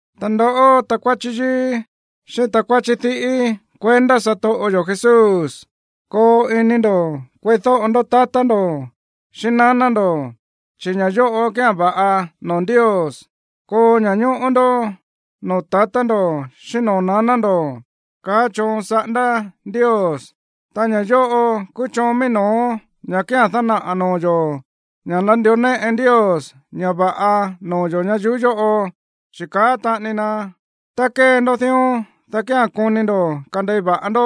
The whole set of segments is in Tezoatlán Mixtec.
Ta ndoꞌó, takuáchí yíí xíꞌín takuáchí diꞌí kuendá satoꞌo yo̱ Jesús, koo ini ndo̱ kueídóꞌo ndó tatá ndo̱ xíꞌín naná ndo̱, chi̱ ña̱ yóꞌo kía̱n va̱ꞌa noo̱ Ndios. “Koo ña̱ñóꞌó ndó noo̱ tatá ndo̱ xíꞌín noo̱ naná ndo̱”, kaá choon saꞌándá Ndios. Ta ña̱ yóꞌo kúú choon mií no̱ó ña̱ kía̱n dánaꞌa̱ noo̱ yo̱ ña̱ nandió néꞌe Ndios ña̱ va̱ꞌa noo̱ yo̱ ñayuú yóꞌo, chi̱ káꞌa̱n taꞌani na: “Tá kée ndó dión, dá kía̱n koni ndo̱ kandei va̱ꞌa ndó,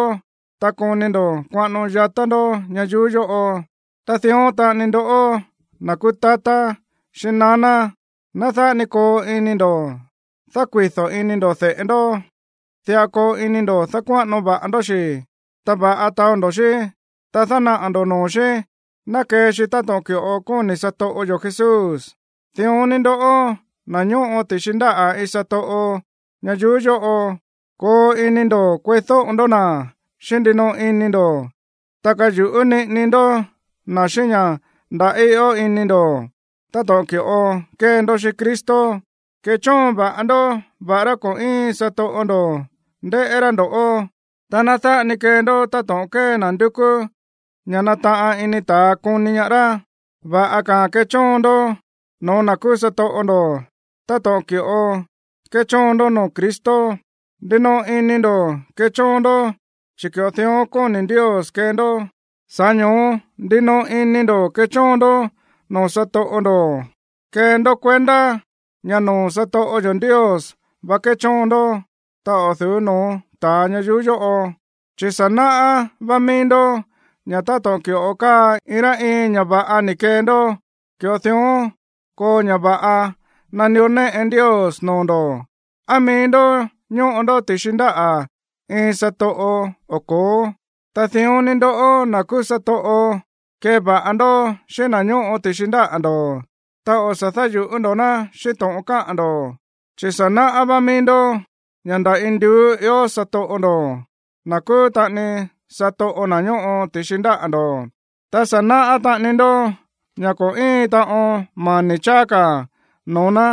ta koni ndo̱ kuaꞌano yatá ndó ñayuú yóꞌo.” Ta dión taꞌani ndoꞌó, na̱ kúú tatá xíꞌín naná, ná dáꞌa ni koo ini ndo̱ dákuido̱ ini ndo̱ de̱ꞌe ndó. Diꞌa koo ini ndo̱ dákuáꞌano va̱ꞌa ndó xi̱, ta va̱ꞌa taó ndo̱ xí, ta dánaꞌa̱ ndo̱ noo̱ xí ná kee xi táto̱ꞌon ki̱ꞌo kóni̱ satoꞌo yo̱ Jesús. Dión ni ndoꞌó, na̱ ñóꞌo ti̱xi ndáꞌa̱ iin satoꞌo ñayuú yóꞌo, koo ini ndo̱ kueídóꞌo ndó na̱ xíꞌín ndinoꞌo ini ndo̱, ta kayu̱ꞌú niꞌini ndó na̱ xíꞌín ña̱ ndaꞌí ió ini ndo̱ táto̱ꞌon ki̱ꞌo kée ndó xíꞌín Cristo. Kechóon va̱ꞌa ndó, va̱ꞌará ko̱ íin satoꞌo ndo̱ ndéꞌé rá ndo̱ꞌó, ta ná dáꞌa ni kee ndó táto̱ꞌon kée na̱ ndúkú ña̱ nataꞌan ini ta̱a koni ñaá rá. Va̱ꞌa ka̱a̱n kechóon ndó no̱ó na̱ kúú satoꞌo ndo̱ táto̱ꞌon ki̱ꞌo kéchóon ndó noo̱ Cristo. Ndinoꞌo ini ndo̱ kechóon ndó, chi̱ ki̱ꞌo dión kóni̱ Ndios kee ndó. Sa̱ꞌá ño̱ó ndinoꞌo ini ndo̱ kechóon ndó noo̱ satoꞌo ndo̱. Kee ndó kuendá ña̱ noo̱ satoꞌo yo̱ Ndios vá kéchóon ndó, ta o̱ du̱ú no̱ó ta̱a ñayuú yóꞌo, chi̱ sa̱ náꞌá vá míí ndó ña̱ táto̱ꞌon ki̱ꞌo káa iin rá iin ña̱ va̱ꞌa ni̱ kee ndó, ki̱ꞌo dión koo ña̱ va̱ꞌa nandió néꞌe Ndios noo̱ ndo̱, á mií ndó ñóꞌo ndó ti̱xi ndáꞌa̱ iin satoꞌo o ko̱ó. Ta dión ni ndoꞌó, na̱ kúú satoꞌo, keva̱ꞌa ndó xíꞌín na̱ ñóꞌo ti̱xi ndáꞌa̱ ndo̱, ta o̱ sa̱ dáyu̱ꞌú ndo̱ ná xíꞌín to̱ꞌon káꞌa̱n ndo̱, chi̱ sa̱ náꞌá vá míí ndó ña̱ nda̱ induú ió satoꞌo ndo̱, na̱ kúú taꞌani satoꞌo na̱ ñóꞌo ti̱xi ndáꞌa̱ ndo̱. Ta sa̱ náꞌá taꞌani ndó ña̱ ko̱ íin taꞌon mani̱ cháá ka̱ noo̱ ná,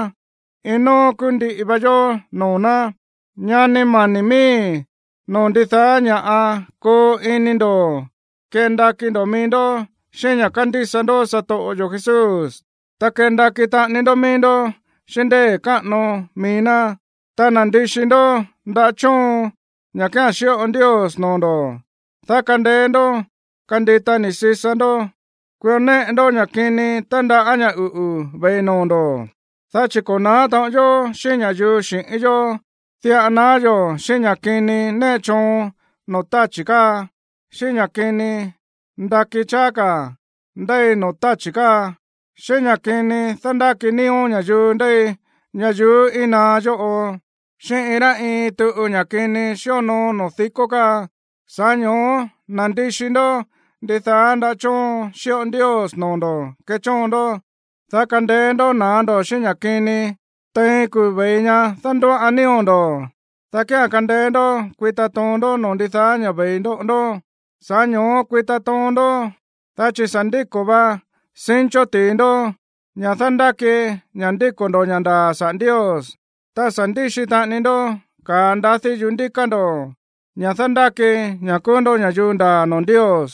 iin nóó kúú ndiꞌi va yó noo̱ ná. Ñani mani̱ miíi̱, noo̱ ndidaá ña̱ꞌa, koo ini ndo̱ kendakí ndó mií ndó xíꞌín ña̱ kándísa ndó satoꞌo yo̱ Jesús, ta kendakí taꞌani ndó mií ndó xíꞌín ndée̱ káꞌano mií ná. Ta nandixi ndó ndaꞌá chóon, ña̱ kía̱n xíꞌo Ndios noo̱ ndo̱, dá kandeé ndó kandita ni̱ sisa ndó kuió néꞌe ndó ña̱ kini tándaꞌá ña̱ uꞌu̱ ve̱i noo̱ ndo̱. Dá chi̱ ko̱ na̱á taꞌon yó xíꞌín ña̱yuu xi̱ꞌín yó, diꞌa naá yo̱ xíꞌín ña̱ kini néꞌe choon noo̱ táchi̱ káa, xíꞌín ña̱ kini ndakí cháá ka̱ ndéi noo̱ táchi̱ káa, xíꞌín ña̱ kini dándáki nío̱ ña̱yuu ndéi ñayuú íin naá yóꞌo, xíꞌín iin rá iin tuꞌu ña̱ kini xíonoo noo̱ díkó káa. Sa̱ꞌá ño̱ó nandixi ndó ndidaá ndaꞌá chóon xíꞌo Ndios noo̱ ndo̱ kechóon ndó, dá kandeé ndó na̱á ndo̱ xíꞌín ña̱ kini tein kuu̱ ve̱i ña̱ dándóꞌoan nío̱ ndo̱, dá kía̱n kandeé ndó kuita toon ndó noo̱ ndidaá ña̱ ve̱i ndoꞌo ndó. Sa̱ꞌá ño̱ó kuita toon ndó, dá chi̱ sa̱ ndíko̱ va cincho ti̱i ndó, ña̱ dándáki ña̱ ndíko̱ ndo̱ ña̱ ndaa̱ saꞌa̱ Ndios. Ta sa̱ ndíxi taꞌani ndó ka̱a ndadí yuꞌú ndíká ndo̱, ña̱ dándáki ña̱ kúú ndó ña̱yuu ndaa̱ noo̱ Ndios.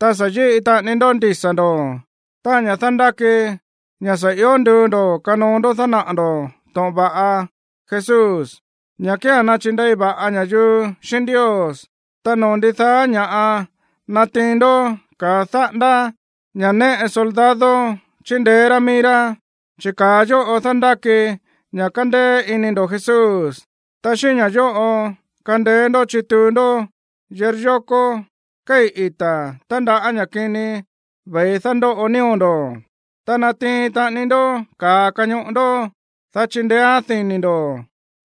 Ta sa̱ yíꞌi taꞌani ndó ndisa̱ ndo̱, táꞌa̱n ña̱ dándáki ña̱ sa̱ ió nduu ndo̱ kanoo ndó dánaꞌa̱ ndo̱ to̱ꞌon va̱ꞌa Jesús, ña̱ kía̱n nachindei va̱ꞌa ña̱yuu xíꞌín Ndios. Ta noo̱ ndidaá ña̱ꞌa natiin ndó ka̱a dáꞌándá, ña̱ néꞌe soldado chindeé rá míí rá, chi̱ ka̱a yóꞌo dándáki ña̱ kándéé iní ndo̱ Jesús. Ta xíꞌín ña̱ yóꞌo kandeé ndó chituu ndó yiryókó kéi̱ ita̱ tándaꞌá ña̱ kini ve̱i dándóꞌo nío̱ ndo̱. Ta natiin taꞌani ndó ka̱a kañoꞌo ndó, dá chindeéán dini̱ ndo̱,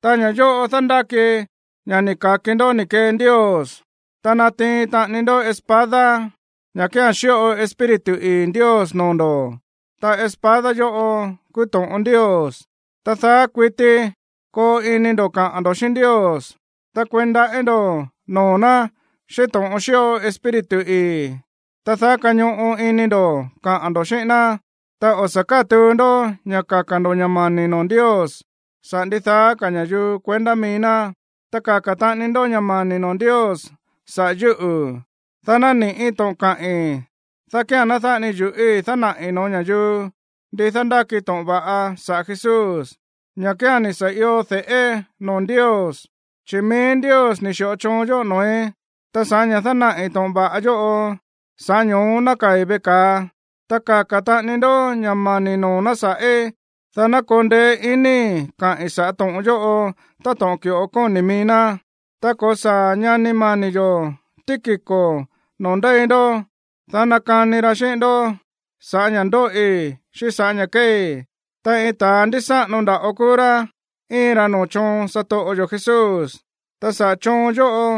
ta ña̱ yóꞌo dándáki ña̱ ni̱ ka̱ki ndó ni̱ kee Ndios. Ta natiin taꞌani ndó espada, ña̱ kía̱n xíꞌo Espíritu ii̱ Ndios noo̱ ndo̱. Ta espada yóꞌo kúú to̱ꞌon Ndios. Ta daá kuití koo ini ndo̱ kaꞌa̱n ndo̱ xíꞌín Ndios, ta kueí ndaꞌí ndo̱ noo̱ ná xíꞌín to̱ꞌon xíꞌo Espíritu ii̱. Ta daá kañoꞌo ini ndo̱ kaꞌa̱n ndo̱ xíꞌín ná, ta o̱ sa̱ kátuu ndó ña̱ kaka̱ ndo̱ ña̱ mani̱ noo̱ Ndios saꞌa̱ ndidaá ka̱ ña̱yuu kuendá mií ná. Ta kaka̱ taꞌani ndó ña̱ mani̱ noo̱ Ndios saꞌa̱ yúꞌu̱, dá nani̱ꞌí to̱ꞌon kaꞌi̱n, dá kía̱n ná dáꞌa ni yu̱ꞌíi̱ dánaꞌi̱ no̱ó ña̱yuu ndi dándáki to̱ꞌon va̱ꞌa saꞌa̱ Jesús, ña̱ kía̱n ni̱ sa̱ io de̱ꞌé noo̱ Ndios, chi̱ mií Ndios ni̱ xi̱ꞌo choon yóꞌo noo̱í, ta sa̱ꞌá ña̱ dánaꞌi̱ to̱ꞌon va̱ꞌa yóꞌo, sa̱ꞌá ño̱ó nákaa̱i̱ veꞌe ka̱a. Ta kaka̱ taꞌani ndó ña̱ mani̱ noo̱ ná sa̱ꞌí, dá ná koo ndeé iníi̱ kaꞌi̱n sa̱ꞌá to̱ꞌon yóꞌo táto̱ꞌon ki̱ꞌo kóni̱ mií ná. Tá ko̱saa̱ ñani mani̱ yo̱ Tíquico noo̱ ndéi ndó, dá nakani ra xíꞌín ndó sa̱ꞌá ña̱ ndóꞌi xíꞌín sa̱ꞌá ña̱ kéei. Ta iin ta̱a ndísáꞌano nda̱ꞌo kúú rá íin ra noo̱ choon satoꞌo yo̱ Jesús. Ta saꞌa̱ choon yóꞌo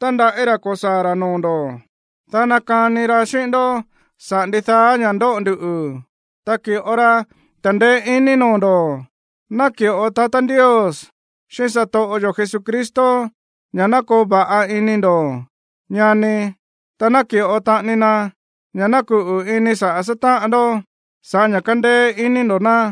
tándaꞌí ra̱ ko̱saa̱ ra̱ noo̱ ndo̱, dá nakani ra xíꞌín ndó saꞌa̱ ndidaá ña̱ ndóꞌo ndu, ta ki̱ꞌo ra ta̱ndeé iní noo̱ ndo̱. Ná ki̱ꞌo tatá Ndios xíꞌín satoꞌo yo̱ Jesucristo ña̱ ná koo va̱ꞌa ini ndo̱ꞌó, ñani, ta ná ki̱ꞌo taꞌani na ña̱ ná kuꞌu̱ ini saꞌa̱ sátáꞌan ndó sa̱ꞌá ña̱ kándéé iní ndo̱ ná.